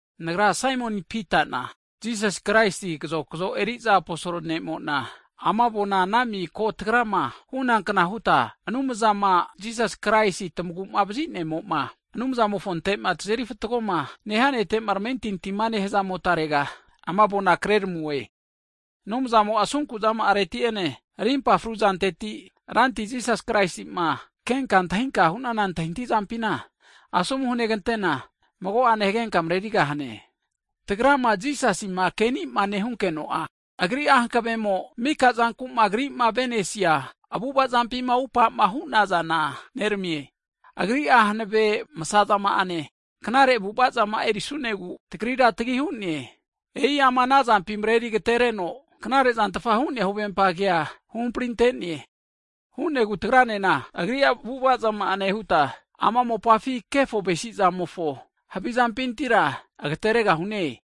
Nagra Saimoni Pitana, Jisas Kraisi kazokzo eriza aposol ne'mo'na, ana miko tagrama hunakna huta Anumzama Jisas Kraisi tamagu'mavazi ne'mo'ma Anumzamofontema tazeri fatgoma nehia Nete'ma tamentintima nehazamotarega, ama avona kreneramue. Anumzamo'a asunku zama'areti'ene, rimpafru zanteti, Ranti Jisasi Kraisima kenka antahinkama hunana antahintahi zampina, asomu hunegante'na mago'ane hagenka mrerigahane. Tagrama Jisasima kenima nehunkeno'a, Agri'a hankavemo mika zanku'ma Agri'ma avenesia avu'ava zampima upama hunazana neramie. Agri'a hanave masazama'ane, knare avu'avazama'a erisunegu, tagrira tagi hu'ne. E'i ama anazampi mareri agatereno, knarezantfa hu'nea huvempa kea huhamprirante'ne, hu'negu tagranena, Agri'a avu'avazama'a nehuta, ama mopafi kefo tavesizamofo havizampintira agateregahune.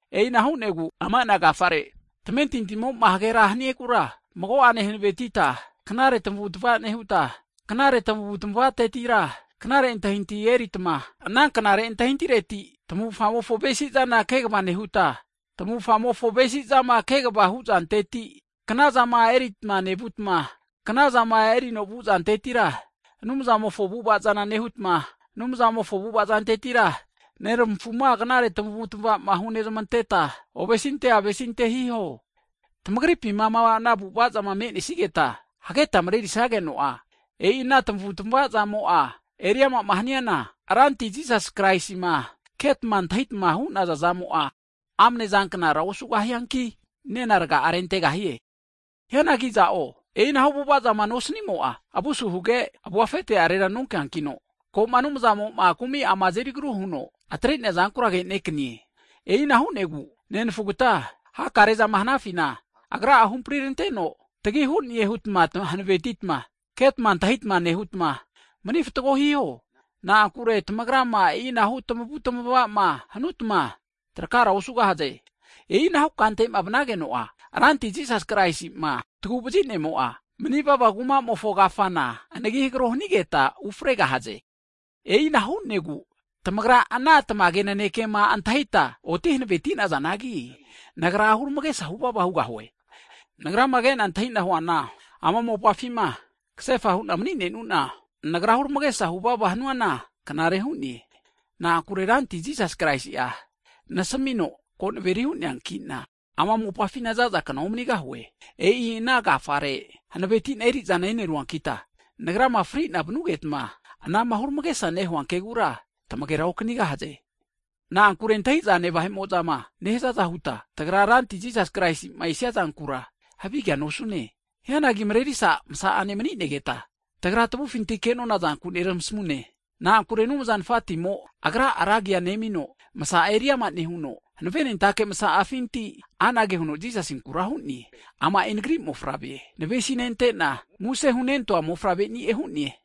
E'ina hu'negu ama ana agafare tamentintimo'ma hage ra hanigura mago'ane hanavetita, knare tmavutmava nehutma, knare tamavutamavatetira, knare antahintahi eneritma, ana knare antahintahireti tamavufamofo avesizana kegva nehutma, tamavufamofo avesizama kegva huzanteti, knazama erita nevutma, knazama erino vuzantetira, Anumzamofo avu'avaza nehutma, Anumzamofo avu'avazantetira, neramafuna knare tamavutmava hunezmanteta ovesinte avesinte hiho. Tamagripima ama ana avu'avazama me'nesigeta hageta mrerisageno'a, e'i ana tamavutamavazamo'a eri amama haniana, Ranti Jisas Kraisima ketma antahitmama hunazazamo'a amnezanknara osugahianki, nena rga'a rentegahie. Hianagi iza'o e'inahu avu'avazama nosanimo'a, avua asu huge, avua afetera nonkeankino, koma Anumzamo'ma kumi'ama azeri agru huno atrente'neazankura agenekanie. E'ina hu'negu nenafugata, hakarezama hanafina, Anumzamo huhamprintanteno tagi hune hutma hanavetitma ketma antahitma nehutma, mani fatgo hiho. Na'ankure tamagrama e'inahu tamavutamavama hanutma trakara osugahaze. E'inahu kantema vnageno'a, Ranti Jisas Kraisi'ma taguvazi nemo'a, manivava kuma'amofo kafana anagi hagro hanigeta ufregahaze. E'ina hu'negu tamagra ana tamage nanekema antahita oti hanaveti'nazanagi, nagra huramagesa huvava hugahue. Nagrama kena antahina huana, ama mopafima kasefa hu'na mni'nenuna, nagra huramagesa huvava hanuana knare hu'ne. Na'ankure Ranti Jisas Kraisi'a nasamino ko naveri hu'neankina, ama mopafina zazakna omanigahue. E'i ana agafare hanavetina erizana eneruankita, nagrama fri'na vanugetma, anama huramagesa nehua kegura, tamagera okanigahaze. Na'ankure antahizane vahe'mo'zama nehazaza huta, tagra Ranti Jisas Kraisima esiazankura havigea nosune. Hianagi Mrerisa msa'ane mni'negeta tagra tavufinti ke'nona zanku neramasamune. Na'ankure Anumza Nafatimo Agra'a ra agi nemino, masa'a eriama nehuno, hanavenentake masa'afinti anage huno Jisasinkura hu'ne, ama'i Nagri Mofavre, navesinentena muse hunentoa Mofavre'ni'e hu'ne.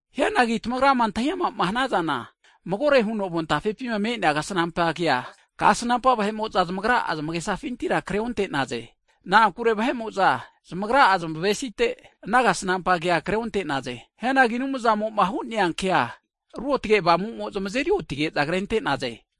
Hianagi tamagrama antahiama'ma hanazana, magore huno avon tafepima me'nea kasnampa kea, kasnampa vahe'mo'za zmagra'a zmagesafintira kreonte'naze. Na'ankure vahe'mo'za zmagra'a zmavesite, ana kasnampa kea kreonte'naze. Hianagi Anumzamo'ma hu'neankea Ruotge Avamumo zmazeri otige'za krente'naze.